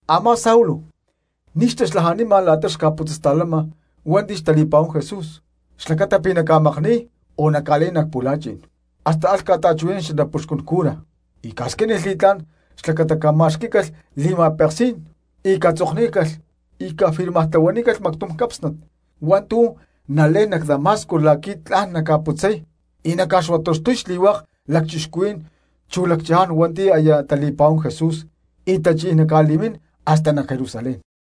Amá Saulo ni̠ xtaxlajanima la̠ta xca̠putzasta̠lama hua̠nti̠ xtali̠pa̠huán Jesús xlacata pi̠ naca̠makni̠y o naca̠lé̠n nac pu̠la̠chi̠n. Hasta alh ca̠ta̠chuhui̠nán xanapuxcún cura y ca̠squínilh li̠tlá̠n xlacata cama̠xquí̠calh li̠ma̠peksí̠n y catzoknícalh cafirmartlahuanícalh mactum cápsnat hua̠ntu̠ nalé̠n nac Damasco la̠qui̠ tla̠n naca̠putzay y naca̠xuataxtuy xli̠hua̠k lacchixcuhuí̠n chu lacchaján hua̠nti̠ aya tali̠pa̠huani̠t Jesús y tachí̠n naca̠li̠mín hasta nac Jerusalén.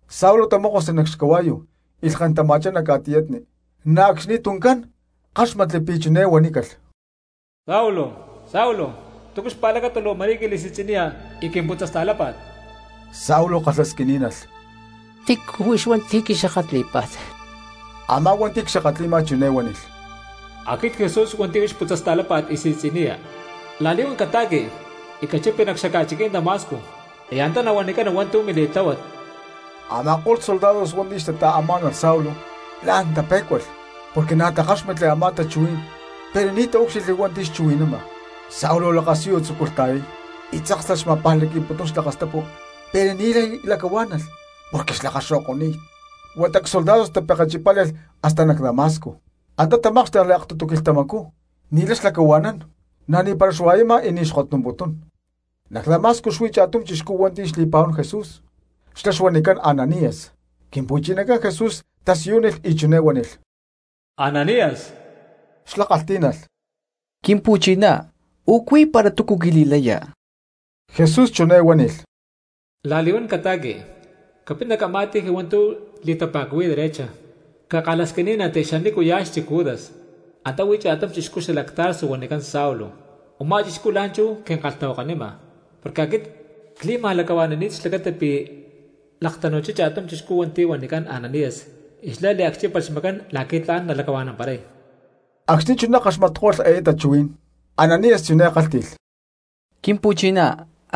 Saulo tamókosli nac xcahua̠yu y lhken tama̠chá nac ca̠tiyatni, na̠ acxni tuncán káxmatli pi̠ chiné huanícalh: —Saulo, Saulo, ¿túcu xpa̠lacata luu ma̠rí quili̠si̠tzi̠niya y quimputzasta̠lápa̠t? Saulo kalhasquiní̠nalh: —¿Tícu huix hua̠nti̠ quixakatlí̠pa̠t? Amá hua̠nti̠ cxakatli̠ma chiné huánilh: —Aquit Jesús hua̠nti̠ huix putzasta̠lápa̠t y si̠tzi̠niya. La̠li̠huán cata̠qui y cachipi nac xaca̠chiquí̠n Damasco y antá nahuanicana hua̠ntu̠ mili̠tláhuat. Ama̠ko̠lh soldados hua̠nti̠ xtata̠amá̠nalh Saulo la̠n tapé̠cualh porque na̠ takáxmatli a̠má tachuhuí̠n pero ni̠ taúcxilhli hua̠nti̠ xchuhui̠nama. Saulo lakasiyu tzúculh ta̠yay, y tzáksalh xma̠pajlaqui̠putún xlakastapu pero ni̠lay lacahuá̠nalh porque xlakaxo̠ko̠ni̠t; huata csoldados tapekechipále̠lh hasta nac Damasco. Antá tamákxtekli aktutu quilhtamacú ni̠lay xlacahua̠nán, na̠ ni̠para xua̠yama y ni̠ xkotnumputún. Nac Damasco xuí cha̠tum chixcú hua̠nti̠ xli̠pa̠huán Jesús xlá xuanicán Ananías. Quimpu̠chinacán Jesús tasiyúnilh y chiné huánilh: —¡Ananías! Xlá kalhtí̠nalh: —Quimpu̠chiná, u̠cuí para túcu quili̠laya. Jesús chiné huánilh: —La̠li̠huán catáca̠xti, capit nac a̠má calle hua̠ntu̠ li̠tapa̠cuhui̠y Derecha, cakalhasquiní̠nanti xanícuya̠ xchic Judas, antá huí cha̠tum chixcú xalac Tarso huanicán Saulo. Umá chixcú la̠nchú quinkalhtahuakanima porque aquit cli̠ma̠lacahua̠ni̠ni̠t xlacata pi̠ laktanu̠chá cha̠tum chixcú hua̠nti̠ huanicán Ananías y xlá liacchípalh xmacán la̠qui̠ tla̠n nalacahua̠namparay. Acxni̠ chuná kaxmatko̠lh eé tachuhuí̠n Ananías chiné kálhti̠lh: —Quimpu̠chiná,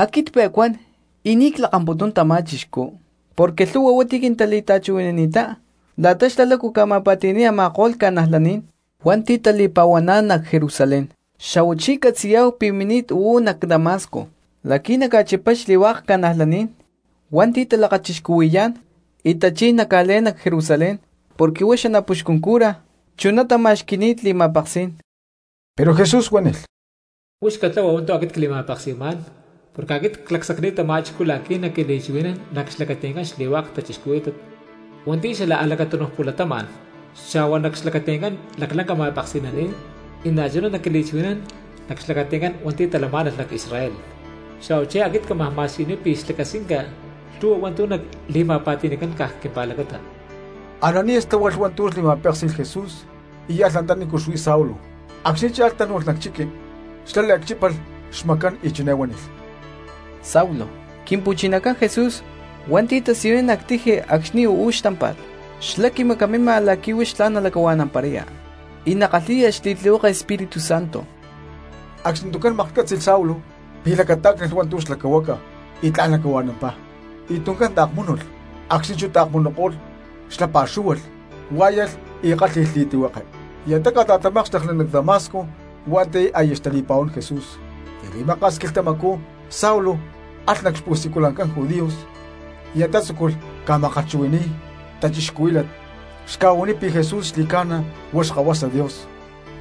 aquit cpe̠cuán y ni̠ clakamputún tamá chixcú, porque lhu̠hua hua̠nti̠ quintali̠ta̠chuhui̠nani̠ttá la̠ta lácu xlá ca̠ma̠pa̠ti̠ni̠y a̠ma̠ko̠lh cristianos hua̠nti̠ tali̠pa̠huaná̠n nac Jerusalén. Xa̠huachí ccatzi̠yá̠hu pi̠ mini̠t uú nac Damasco la̠qui̠ naca̠chipay xli̠hua̠k cristianos hua̠nti̠ talakachixcuhui̠yá̠n y tachí̠n naca̠lé̠n nac Jerusalén, porque huá xanapuxcún cura chuná tama̠xqui̠ni̠t li̠ma̠peksí̠n. Pero Jesús huánilh: —Huix catlahua hua̠ntu̠ aquit cli̠ma̠peksi̠má̠n porque aquit clacsacni̠t tamá chixcú la̠qui̠ naquili̠chuhui̠nán nac xlacati̠ncán xli̠hua̠k cristianos hua̠nti̠ xala a̠lacatúnuj pu̠latama̠n, xa̠hua nac xlacati̠ncán laclanca ma̠peksi̠naní̠n, y na̠chuná naquili̠chuhui̠nán nac xlacati̠ncán hua̠nti̠ talamá̠nalh nac Israel. Xa̠huachí aquit cámaj ma̠siyuniy pi̠ xlacasquinca lhu̠hua hua̠ntu̠ nali̠ma̠pa̠ti̠ni̠cán caj quimpa̠lacata. Ananías tláhualh hua̠ntu̠ li̠ma̠péksi̠lh Jesús y alh antanícu xuí Saulo. Acxni̠ cha̠lh tánu̠lh nac chiqui, xlá liacchípalh xmacán y chiné huánilh: —¡Saulo! Quimpu̠chinacán Jesús hua̠nti̠ tasiyunín nac tiji acxni̠ uú xtámpa̠t, xlá quimacamima la̠qui̠ huix tlán nalacahua̠namparaya y nakalhi̠ya xli̠tlihueke Espíritu Santo. Acxni tuncán maklhcátzi̠lh Saulo pi̠ lacatá̠ctalh hua̠ntu̠ xlacahuaca y tla̠n lacahua̠nampá, y tuncán taakmúnulh. Acxni̠ chú taakmunuko̠lh xlá pa̠xúhualh huá̠yalh y kálhi̠lh li̠tlihueke, y antá ca̠ta̠tamákxtekli nac Damasco hua̠nti̠ aya xtali̠pa̠huán Jesús. Ni̠ li̠maka̠s quilhtamacú Saulo alh nac xpu̠siculancán judíos y antá tzúculh ca̠ma̠kalhchuhui̠ni̠y cristianos xca̠huaniy pi̠ Jesús xli̠ca̠na huá Xkahuasa Dios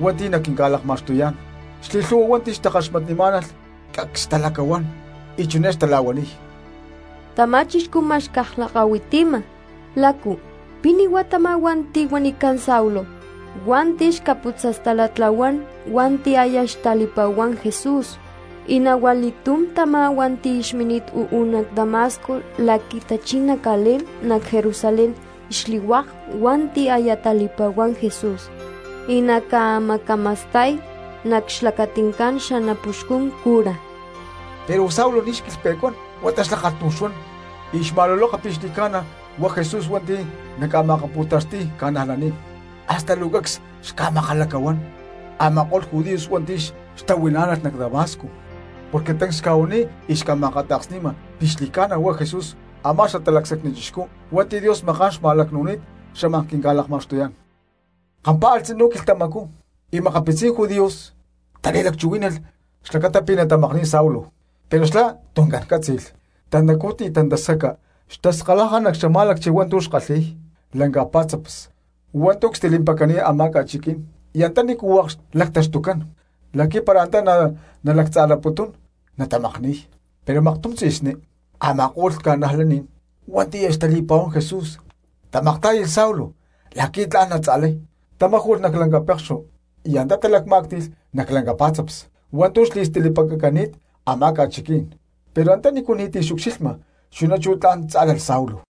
hua̠nti̠ naquinca̠lakma̠xtuyá̠n. Xli̠lhu̠hua hua̠nti̠ xtakaxmatnimá̠nalh cacs xtalacahuán y chiné xtala̠huaniy: —Tamá chixcú ma̠x caj lakahuitima, ¿lácu pi̠ ni̠huá tamá hua̠nti̠ huanicán Saulo hua̠nti̠ xca̠putzasta̠latla̠huán hua̠nti̠ aya xtali̠pa̠huán Jesús? Y na̠ hua li̠túm tamá hua̠nti̠ xmini̠t uú nac Damasco la̠qui̠ tachí̠n naca̠lé̠n nac Jerusalén xli̠hua̠k hua̠nti̠ aya tali̠pa̠huán Jesús, y naca̠macama̠sta̠y nac xlacati̠ncán xanapuxcún cura. Pero Saulo ni̠ xquilhpe̠cuán huata xlá kalhtum xuan y xma̠luloka pi̠ xli̠ca̠na huá Jesús hua̠nti̠ naca̠ma̠akapu̠taxti̠y cristianos, hasta luu cacs xca̠makalacahuán a̠ma̠ko̠lh judíos hua̠nti̠ xtahuilá̠nalh nac Damasco porque tancs xca̠huaniy y xca̠ma̠akata̠ksni̠ma pi̠ xli̠ca̠na huá Jesús amá xatalacsacni chixcú hua̠nti̠ Dios maká̠n xma̠lacnúni̠t xámaj quinca̠lakma̠xtuyá̠n. Kampá̠alh tzinú quilhtamacú y makapitzí̠n judíos tali̠lacchuhuí̠nalh xlacata pi̠ natamakni̠y Saulo, pero xlá tuncán cátzi̠lh. Tantacú y tantascaca xtaskalaja nac xama̠lacchi hua̠ntu̠ xkalhi̠y lanca pa̠tzaps hua̠ntu̠ cstilimpacani̠t a̠má ca̠chiquí̠n y antanícu hua̠k xlactaxtucán, la̠qui̠ para antá natzalaputún natamakni̠y. Pero maktum tzi̠sní a̠ma̠ko̠lh cristianos hua̠nti̠ aya xtali̠pa̠huán Jesús tamaktá̠yalh Saulo la̠qui̠ tla̠n natza̠lay, tamáju̠lh nac pektum lanca cana̠sta y antá talacmá̠cti̠lh nac lanca pá̠tzaps hua̠ntu̠ xli̠stilimpacani̠t a̠má ca̠chiquí̠n, pero antanícu ni̠ti̠ naucxilha; chuná chú tla̠n tzá̠lalh Saulo.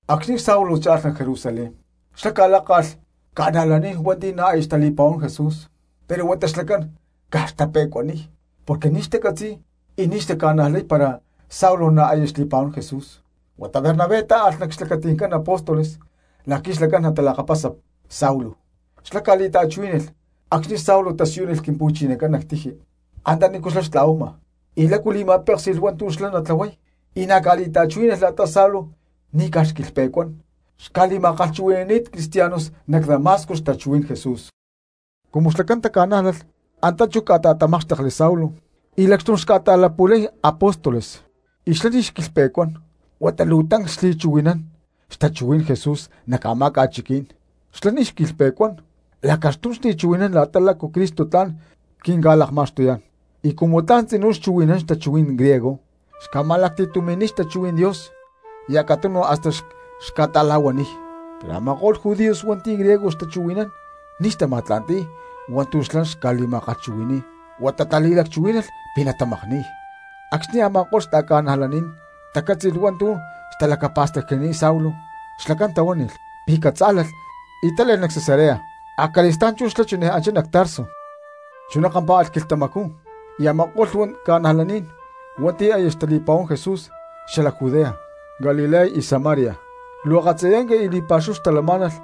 Acxni̠ Saulo cha̠lh nac Jerusalén xlá ca̠lákalh cristianos hua̠nti̠ na̠ xtali̠pa̠huán Jesús pero huata xlacán caj xtape̠cuaniy porque ni̠ xtacatzi̠y y ni̠ xtaca̠najlay para Saulo na̠ aya xli̠pa̠huán Jesús. Huata Bernabé tá̠alh nac xlacati̠ncán apóstoles la̠qui̠ xlacán natalakapasa Saulo. Xlá ca̠li̠ta̠chuhuí̠nalh acxni̠ Saulo tasiyúnilh Quimpu̠chinacán nac tiji antanícu xtla̠huama y lácu li̠ma̠péksi̠lh hua̠ntu̠ xlá natlahuay, y na̠ ca̠li̠ta̠chuhuí̠nalh la̠ta Saulo ni̠caj xquilhpe̠cuán xca̠li̠ma̠kalhchuhui̠ní̠t cristianos nac Damasco xtachuhuí̠n Jesús. Cumu xlacán taca̠nájlalh antá chú ca̠ta̠tamákxtekli Saulo y lacxtum xca̠ta̠latapu̠li̠y apóstoles, y xlá ni̠ xquilhpe̠cuán huata luu tancs xli̠chuhui̠nán xtachuhuí̠n Jesús nac a̠má ca̠chiquí̠n. Xlá ni̠ xquilhpe̠cuán lacaxtum xli̠chuhui̠nán la̠ta lácu Cristo tla̠n quinca̠lakma̠xtuyá̠n, y cumu tla̠n tzinú xchuhui̠nán xatachuhuí̠n griego xca̠ma̠lacti̠tumi̠niy xtachuhuí̠n Dios acatunu hasta xca̠ta̠la̠huaniy, pero a̠ma̠ko̠lh judíos hua̠nti̠ griego xtachuhui̠ncán ni̠ xtama̠tla̠nti̠y hua̠ntu̠ xlá xca̠li̠ma̠kalhchuhui̠ni̠y huata tali̠lacchuhuí̠nalh pi̠ natamakni̠y. Acxni̠ a̠ma̠ko̠lh xta̠ca̠najlaní̠n tacátzi̠lh hua̠ntu̠ xtalacapa̠stacnini̠t Saulo, xlacán tahuánilh pi̠ catzá̠lalh y tále̠lh nac Cesarea, acali̠stá̠n chú xlá chiné anchá nac Tarso. Chuná kampá̠alh quilhtamacú y a̠ma̠ko̠lh cristianos hua̠nti̠ aya xtali̠pa̠huán Jesús xalac Judea, Galilea y Samaria luu akatzayanca y li̠pa̠xúhu xtalamá̠nalh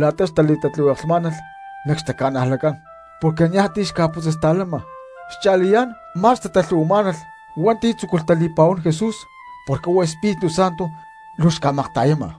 la̠ta xtatatlihueklhmá̠nalh nac xtaca̠najlatcán porque niaj ti̠ xca̠putzasta̠lama; xcha̠liyá̠n ma̠s xtatalhu̠hui̠má̠nalh hua̠nti̠ tzúculh tali̠pa̠huán Jesús porque huá Espíritu Santo luu xca̠makta̠yama.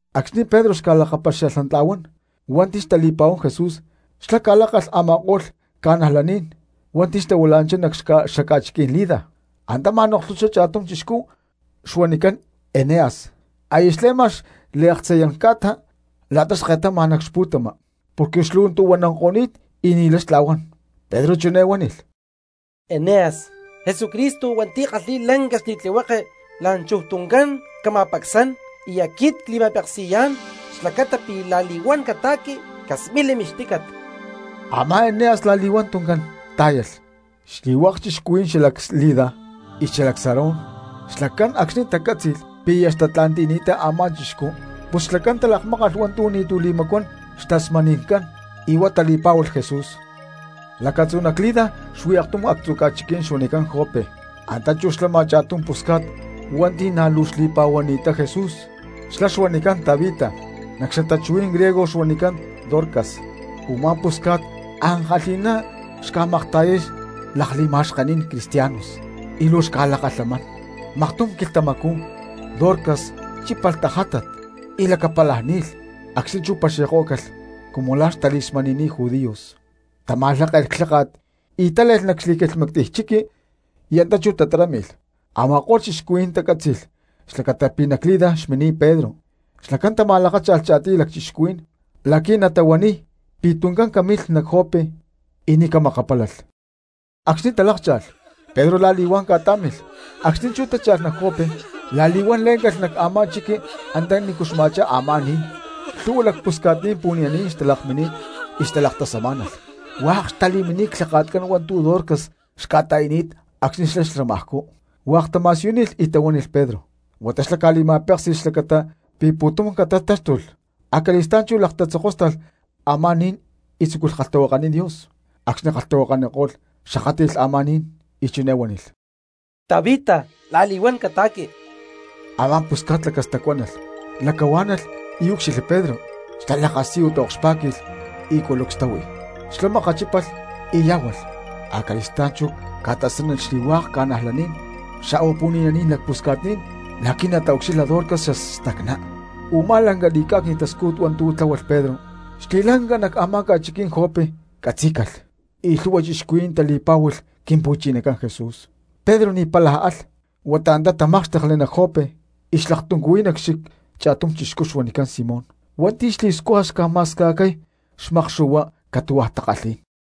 Acxni̠ Pedro xca̠lakapaxia̠lhnantla̠huán hua̠nti̠ xtali̠pa̠huán Jesús xlá ca̠lákalh a̠ma̠ko̠lh cristianos ca̠najlaní̠n hua̠nti̠ xtahuila̠nanchá nac xaca̠chiquí̠n Lida. Antá ma̠noklhuchá cha̠tum chixcú xuanicán Eneas aya xle̠ma xliaktzayán ca̠ta la̠ta xke̠tama nac pu̠tama porque xlu̠ntu̠huananko̠ni̠t y ni̠lay xtla̠huán. Pedro chiné huánilh: —Eneas, Jesucristo hua̠nti̠ kalhi̠y lanca li̠tlihueke la̠nchuj tuncán cama̠pacsán, y aquit cli̠ma̠peksi̠yá̠n xlacata pi̠ la̠li̠huán cata̠qui, casmili mixtícat. Amá Eneas la̠li̠huan tuncán tá̠yalh. Xli̠hua̠k cristianos xalac Lida y xalac Sarón xlacán acxní tacá̠tzi̠lh pi̠ aya xtatla̠nti̠ni̠ttá a̠ma̠ chixcú, pus xlacán talakmákalh hua̠ntu̠ ni̠tu̠ xli̠macuán xtasmani̠ncán y huá tali̠pá̠hualh Jesús. Lacatzú nac Lida xuí aktum actzu̠ ca̠chiquí̠n xuanicán Jope, antá chú xlama cha̠tum pusca̠t hua̠nti̠ na̠ luu xli̠pa̠huani̠ttá Jesús xlá xuanicán Tabita, nac xatachuhuí̠n griego xuanicán Dorcas. Umá pusca̠t ankalhi̠ná xca̠makta̠yay lakli̠ma̠xkení̠n cristianos y luu xca̠lakalhamán. Maktum quilhtamacú Dorcas chípalh tajátat y lacapálaj ni̠lh. Acxni̠ chú paxi̠kó̠calh cumu la̠ xtali̠smani̠ni̠t judíos, tama̠lháke̠lh clháka̠t y tále̠lh nac xli̠quilhmactiy chiqui y antá chú tatarámi̠lh. Ama̠ko̠lh cristianos tacátzi̠lh xlacata pi̠ nac Lida xmini̠t Pedro xlacán tama̠lakácha̠lh cha̠tiy lacchixcuhuí̠n la̠qui̠ natahuaniy pi̠ tuncán camilh nac Jope y ni̠ camakapálalh. Acxni̠ talákcha̠lh, Pedro la̠li̠huán ca̠tá̠milh, acxni̠ chú tácha̠lh nac Jope la̠li̠huán lé̠ncalh nac a̠má chiqui antaní xma̠chá a̠má ni̠n. Lhu̠hua lacpusca̠tní̠n pu̠ni̠naní̠n xtalakmini̠t y xtalaktasamá̠nalh, hua̠k xtali̠mini̠t clhaka̠tcán hua̠ntu̠ Dorcas xca̠ta̠i̠ni̠t acxni̠ xlá xlamajcú, hua̠k tama̠siyúnilh y tahuánilh Pedro. Huata xlá ca̠li̠ma̠péksi̠lh xlacata pi̠ pu̠tum catatáxtulh, acali̠stá̠n chú lakatatzokóstalh a̠má ni̠n y tzúculh kalhtahuakaniy Dios. Acxni̠ kalhtahuakako̠lh xakátli̠lh a̠má ni̠n y chiné huánilh: —¡Tabita, la̠li̠huán cata̠qui! Amá pusca̠t lacastacuánalh, lakahuá̠nalh y úcxilhli Pedro, xlá lakasiyu taokxpá̠qui̠lh y culucs táhui. Xlá makachípalh y yá̠hualh, acali̠stá̠n chú ca̠tasánilh xli̠hua̠k ca̠najlaní̠n xa̠hua pu̠ni̠naní̠n lacpusca̠tní̠n la̠qui̠ nataucxilha Dorcas xastacná. Umá lanca li̠cá̠cni̠t tascújut hua̠ntu̠ tláhualh Pedro xli̠ca̠lanca nac a̠má xaca̠chiquí̠n Jope catzí̠calh, y lhu̠hua cristianos tali̠pá̠hualh Quimpu̠chinacán Jesús. Pedro ni̠ pála alh huata antá tamákxtekli nac Jope y xlaktuncuhuiy nac xchic cha̠tum chixcú xuanicán Simón hua̠nti̠ xli̠scuja xca̠ma̠sca̠cay xmakxu̠hua catu̠hua takalhí̠n.